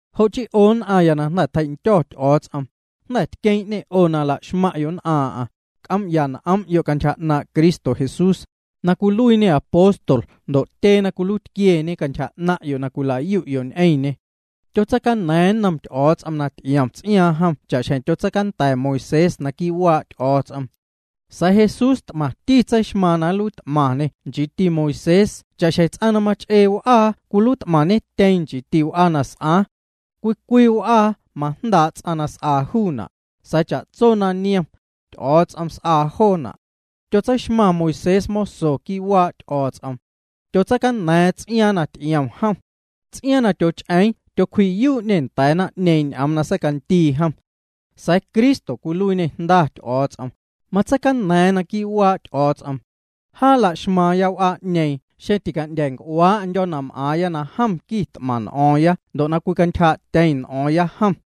Jo' chii, 'o nn'aⁿya na jnda̱ tjei'ndyo̱ Ty'o̱o̱ts'om 'o, na jnda̱ tqueeⁿ'ñê 'o na la'xmaⁿ'yo' nn'aaⁿ'aⁿ, c'oom'ya n'om'yo' cantyja 'naaⁿ' Cristo Jesús, na cwiluiiñê apóstol ndo' mati tyee na tjacantyja cantyja 'naaⁿ'yo' na cwila'yu'yo' ñ'eⁿñê. Tyotseicana̱a̱ⁿ nnom Ty'o̱o̱ts'om na ty'iom ts'iaaⁿ jom cha'xjeⁿ tyotseicanda̱ Moisés quii' waa' Ty'o̱o̱ts'om. Sa̱a̱ Jesús t'maⁿti tseixmaaⁿ na nluiit'maⁿñê nchiiti Moisés cha'xjeⁿ ts'aⁿ na mach'ee w'aa cwiluiit'maⁿñetyeⁿ nchiiti w'aa na s'aaⁿ. Cwii cwii w'aa majndaa' ts'aⁿ na s'aa juuna', sa̱a̱ cha'tso na niom, Ty'o̱o̱ts'om s'aa joo jo'. Tyotseixmaⁿ Moisés moso quii' waa' Ty'o̱o̱ts'om. Tyotseicaña̱a̱ⁿ ts'iaaⁿ na ty'iom jom. Ts'iaaⁿ na tyoch'eeⁿ tyocwji'yuu'ñê nda̱a̱ naⁿ'ñeeⁿ ñ'oom na secandii jom. Sa̱a̱ Cristo na cwiluiiñê jnda Ty'o̱o̱ts'om, matseicana̱a̱ⁿ quii' waa' Ty'o̱o̱ts'om. Jaa laxmaaⁿya w'aa'ñeeⁿ xeⁿ tica'ndya̱a̱ nc'uaa'ndyo̱o̱ na m'aaⁿya na jom quit'maⁿ n'o̱o̱ⁿ ndo' na cwicantyjaa'tyeⁿ n'o̱o̱ⁿya jom.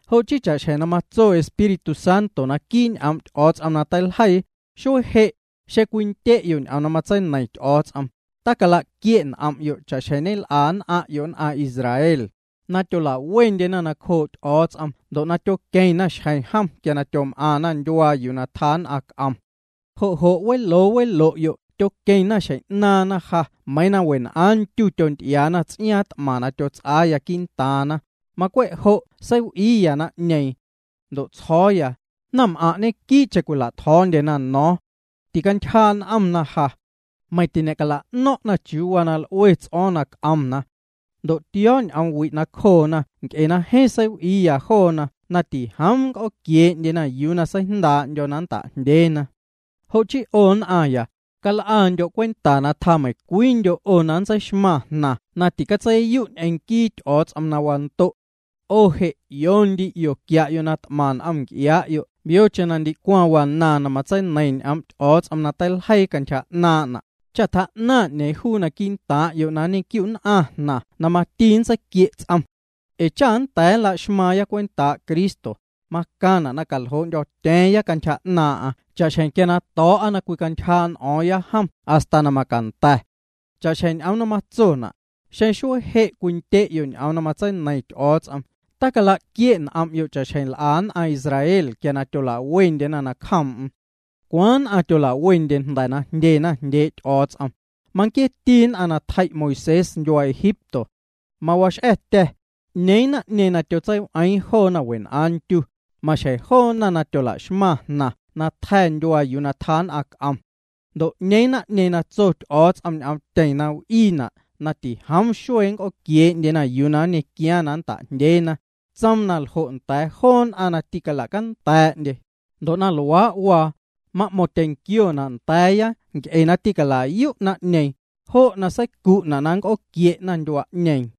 Jo' chii cha'xjeⁿ matso Espíritu Santo naquii' ñ'oom' Ty'o̱o̱ts'om na teiljeii: Xuee je', xeⁿ cwindye'yo' ñ'oom na matseineiⁿ Ty'o̱o̱ts'om, tala'quie' n'om'yo' cha'xjeⁿ ñel'a nn'aⁿ'yo' nn'aⁿ Israel, na tyola'wendyena nacjoo' Ty'o̱o̱ts'om ndo' tyoqueⁿna xjeⁿ jom quia na tyom'aⁿna ndyuaa yuu tjaa nn'aⁿ c'om. Jo' jo' weloo welo'yo' tyoqueⁿna xjeⁿ 'naaⁿna ja meiiⁿ wenn'aaⁿ ndyu tyonty'iaana ts'iaaⁿ t'maⁿ na tyots'aaya quii'ntaaⁿna, macwe' jo' seiw'iiya naⁿ'ñeeⁿ. Ndo' tsjo̱o̱ya: “Naⁿm'aⁿ' ñenquii'cheⁿ cwila'tjo̱o̱ndyena no̱o̱ⁿ. Tîcantyjaa' n'omna ja. Meiⁿ tiñe'cala'no̱ⁿna' chiuu waa na l'ue ts'o̱o̱ⁿ na c'omna.” Ndo' tio̱o̱ ñ'oom wi' cjoona nc'e na jeeⁿ seiw'iiya joona na tijoom nnc'ooquiee'ndyena yuu na seijndaa'ndyo̱ na nnta'jndyeena. Jo' chii 'o nn'aⁿya, cal'andyo' cwenta na tjaa meiⁿ cwiindyo' 'o na nntseixmaⁿ jnaⁿ na ticatseiyu' ñ'eⁿ nquii Ty'o̱o̱ts'om na wando'. 'O je' 'io ndi 'io quia'yo' na t'maⁿ n'om nc'iaa'yo' yocheⁿ na ndicwaⁿ wanaaⁿ na matseineiⁿ ñ'oom' Ty'o̱o̱ts'om na teiljeii cantyja 'naaⁿ'na', cha tjaa 'ñeeⁿ juu quii'ntaaⁿ'yo' na nñequiu'nn'aⁿ jnaⁿ juu na mati nntseiquie' ts'om. Ee cha nnda̱a̱ nlaxmaaⁿya cwentaa' Cristo, macaⁿna' na caljoo'ndyo̱tya̱a̱ⁿya cantyja 'naaⁿ'aⁿ cha'xjeⁿ quia na to̱o̱'a na cwicantyjaa' n'o̱o̱ⁿya jom hasta na macanda̱. Cha'xjeⁿ ñ'oom na matsona': Xeⁿ xuee je' cwindye'yo' ñ'oom na matseineiⁿ Ty'o̱o̱ts'om, talaquie' n'om'yo' cha'xjeⁿ l'a nn'aⁿ Israel quia tyola'wendyena nacjoom'm. ¿Cwaaⁿ nn'aⁿ na tyola'wendye jnda̱ na jndyena jndyee' Ty'o̱o̱ts'om? Manquieeti nn'aⁿ na tjei' Moisés ndyuaa Egipto. Mawax'a̱tya̱, ¿'ñee naⁿ'ñeeⁿ na tyotseiw'eeⁿ joona wenn'aaⁿ ndyu? Ñequio joo na tyolaxmaⁿ jnaⁿ na tja̱ ndyuaa yuu tjaa nn'aⁿ c'om. Ndo' ¿'ñeeⁿ naⁿ'ñeeⁿ na tso Ty'o̱o̱ts'om ñ'oomtyeⁿ na w'iina' na tijoom xuee nnc'ooquiee'ndye yuu na nñequiaaⁿ na nnta'jndyeena? Tsoom na ljo' nda̱a̱ joo nn'aⁿ na tîcalacanda̱a̱'ndye. Ndo' na luaa' waa, ma'mo̱ⁿtyeⁿnquiona' nda̱a̱ya nc'e na tîcala'yu' naⁿ'ñeeⁿ, jo' na seicu'na' na nnc'ooquie'na ndyuaa'ñeeⁿ.